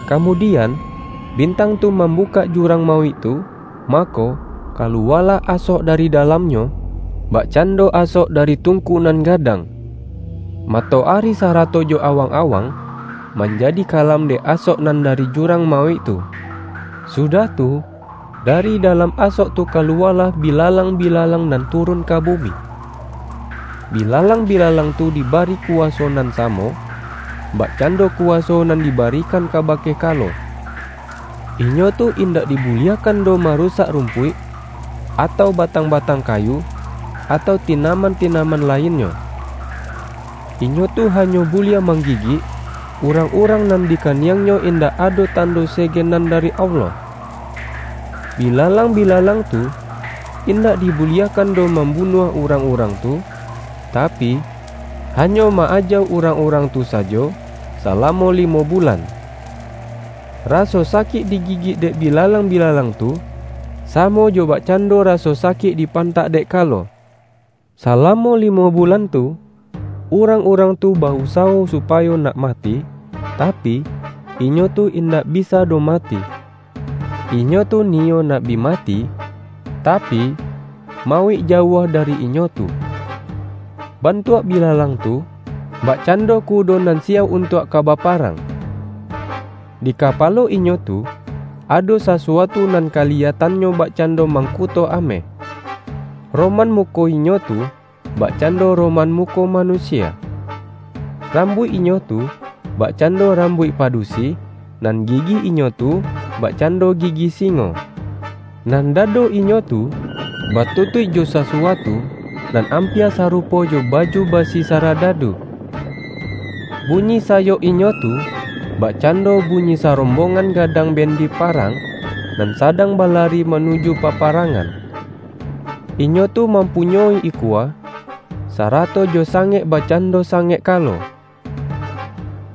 Kamudi-an, bintang tu mambukak jurang ma-uik tu, mako, kaluwalah asok dari da-lamnyo, bakcando asok dari tungku nan gadang. Matoari sarato jo awang-awang, manjadi kalam dek asok nan dari jurang mauik tu. Sudah tu, da-ri dalam asok tu kaluwalah bilalangbilalang nan turun ka bumi. Bilalang-bilalang tu dibari kuwaso nan samo, bakcando kuwaso nan dibarikan ka-bake kalo. Inyo tu indak dibuliahkan doh marusak rumpuik, atau batang-batang kayu, atau tinaman-tinamam lainnyo. Inyo tu hanyo buliah mang-gigik, urang-urang nan di kaniangnyo indak ado tando sege nan dari Allah. Bilalang-bilalang tu, indak dibuliah-kan doh mambunuah urang-urang tu, tapi, hanyo ma-ajauk urang-urang tu sajo salamo limo bulan. Raso sakik di-gigik dek bilalang-bilalang tu, samo jo bakcando raso sakik dipantak dek kalo. Salamo limo bulan tu, urang-urang tu ba-usawo supayo nak mati, tapi, inyo tu indak bisa doh mati; inyo tu niyo nak bi mati, tapi, mauik jauah dari inyo tu. Bantuak bilalang tu, bakcando ku-do nan siyauk untuak ka baparang. Di kapalo inyo tu, ado sasuatu nan kali-yatannyo bakcando mangkuto ameh. Roman muko inyo tu, bakcando ro-man muko manusia. Rambuik inyo tu, bakcando rambuik padusi, nan gi-gi inyo tu, bakcando gigi singo. Nan dado inyo tu, batutuik jo sasuatu nan ampia sarupo jo baju basi saradadu. Bunyi sayok inyo tu, bakcando bunyi sarombongan gadang bendi parang, nan sadang balari manuju paparang-an. Inyo tu mampunyoi ikua, sarato jo sangek bakcando sangek kalo.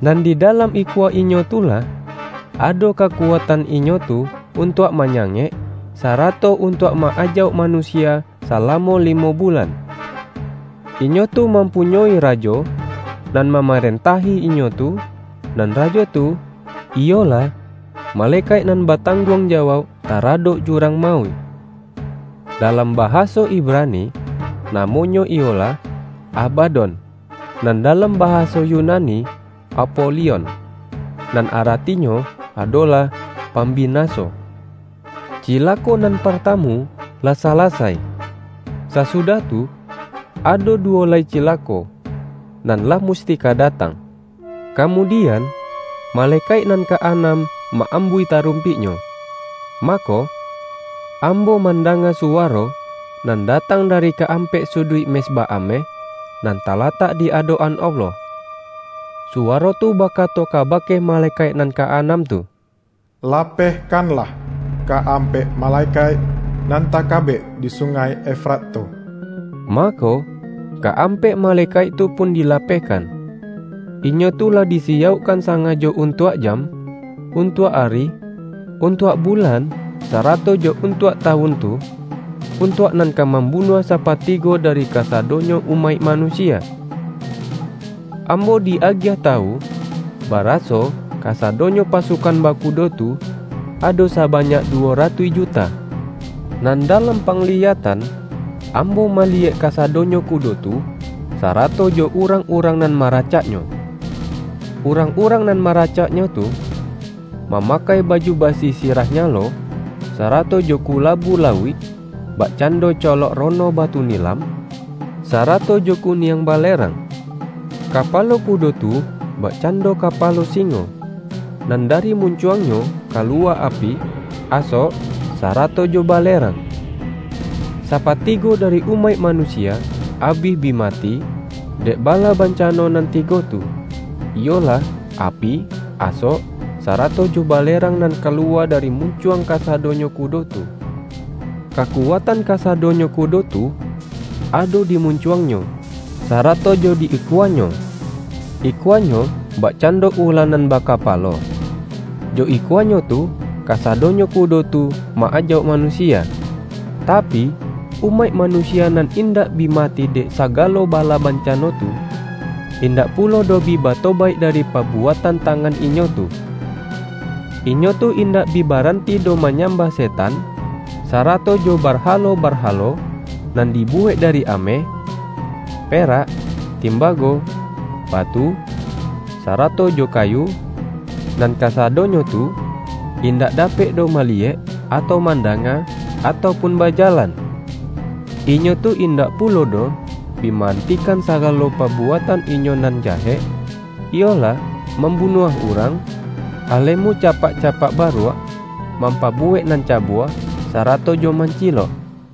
Nan di dalam ikua inyo tu lah, ado kaku-atan inyo tu untuak manyangek, sara-to untuak ma-ajauk manusia salamo limo bulan. Inyo tu mampunyoi ra-jo, nan mamarentahi inyo tu, nan rajo tu, iyolah, malekaik nan batangguang jawauk taradok jurang mauik. Dalam bahaso Ibrani, namonyo iyolah Aba-don; nan dalam bahaso Yunani Apo-lion, (nan aratinyo adolah”Pambina-so"). Cilako nan partamu, lah salasai. Sasudah tu, ado duwo lai cilako, nan lah musti ka datang. Kamudian, malekaik nan ka-anam ma-ambuih tarumpiknyo. Ma-ko, ambo mandanga suwaro, nan da-tang dari ka-ampek suduik mezbah ameh, nan talatak di adok-an Allah. Suwaro tu bakato kabake male-kaik nan ka-anam tu,”Lapehkanlah ka-ampek malekaik nan takabek di Sungai Efrat tu!” Mako, ka-ampek malekaik tu pun dilapehkan. Inyo tu lah disiyaukkan sangajo untuak jam, untuak ari, untuak bulan sarato jo un-tuak tawun tu, untuak nan ka mam-bunuah sapatigo dari kasadonyo umaik manusia. Ambo di-agiah ta-wu, baraso kasadonyo pasukan baku-do tu, ado sabanyak duwo ratuih ju-ta. Nan dalam pangliyatan, ambo maliyek kasadonyo kudo tu, sarato jo urang-urang nan maracaknyo. Urang-urang nan maracaknyo tu, mamakai baju basi sirah nyalo, sarato jo kula-bu lauik, bakcando colok rono batu nilam, sarato jo kuniang balerang. Ka-palo kudo tu bakcando kapalo singo, nan dari muncuangnyo kaluwa api, asok, sarato jo balerang. Sapatigo dari umaik manusia abih bi mati, dek bala bancano nan tigo tu; iyolah api, asok, sarato jo balerang nan kaluwa dari muncuang kasadonyo kudo tu. Kakuatan kasadonyo kudo tu, ado di muncuangnyo, sarato jo di ikua-nyo. Ikuanyo bakcando ula nan ba-kapalo. Jo ikuanyo tu, kasadonyo ku-do tu ma-ajauk manusia. Tapi, umaik manusia nan indak bi mati dek sagalo bala bancano tu, indak pulo doh bi batobaik dari pa-buatan tangan inyo tu. Inyo tu indak bi baranti doh manyambah setan, sa-rato jo barhalo-barhalo, nan dibuwek dari ameh, perak, timbago, batu, sa-rato jo kayu, nan kasadonyo tu, indak dapek doh maliyek, atau man-danga, atau pun bajalan. Inyo tu indak pulo doh bi ma-antikan saga-lo pabuatan inyo nan jahek, iyolah, mambunuah urang, alemu capak-ca-pak baruak, mampabuwek nan cabua, sarato jo mancilok.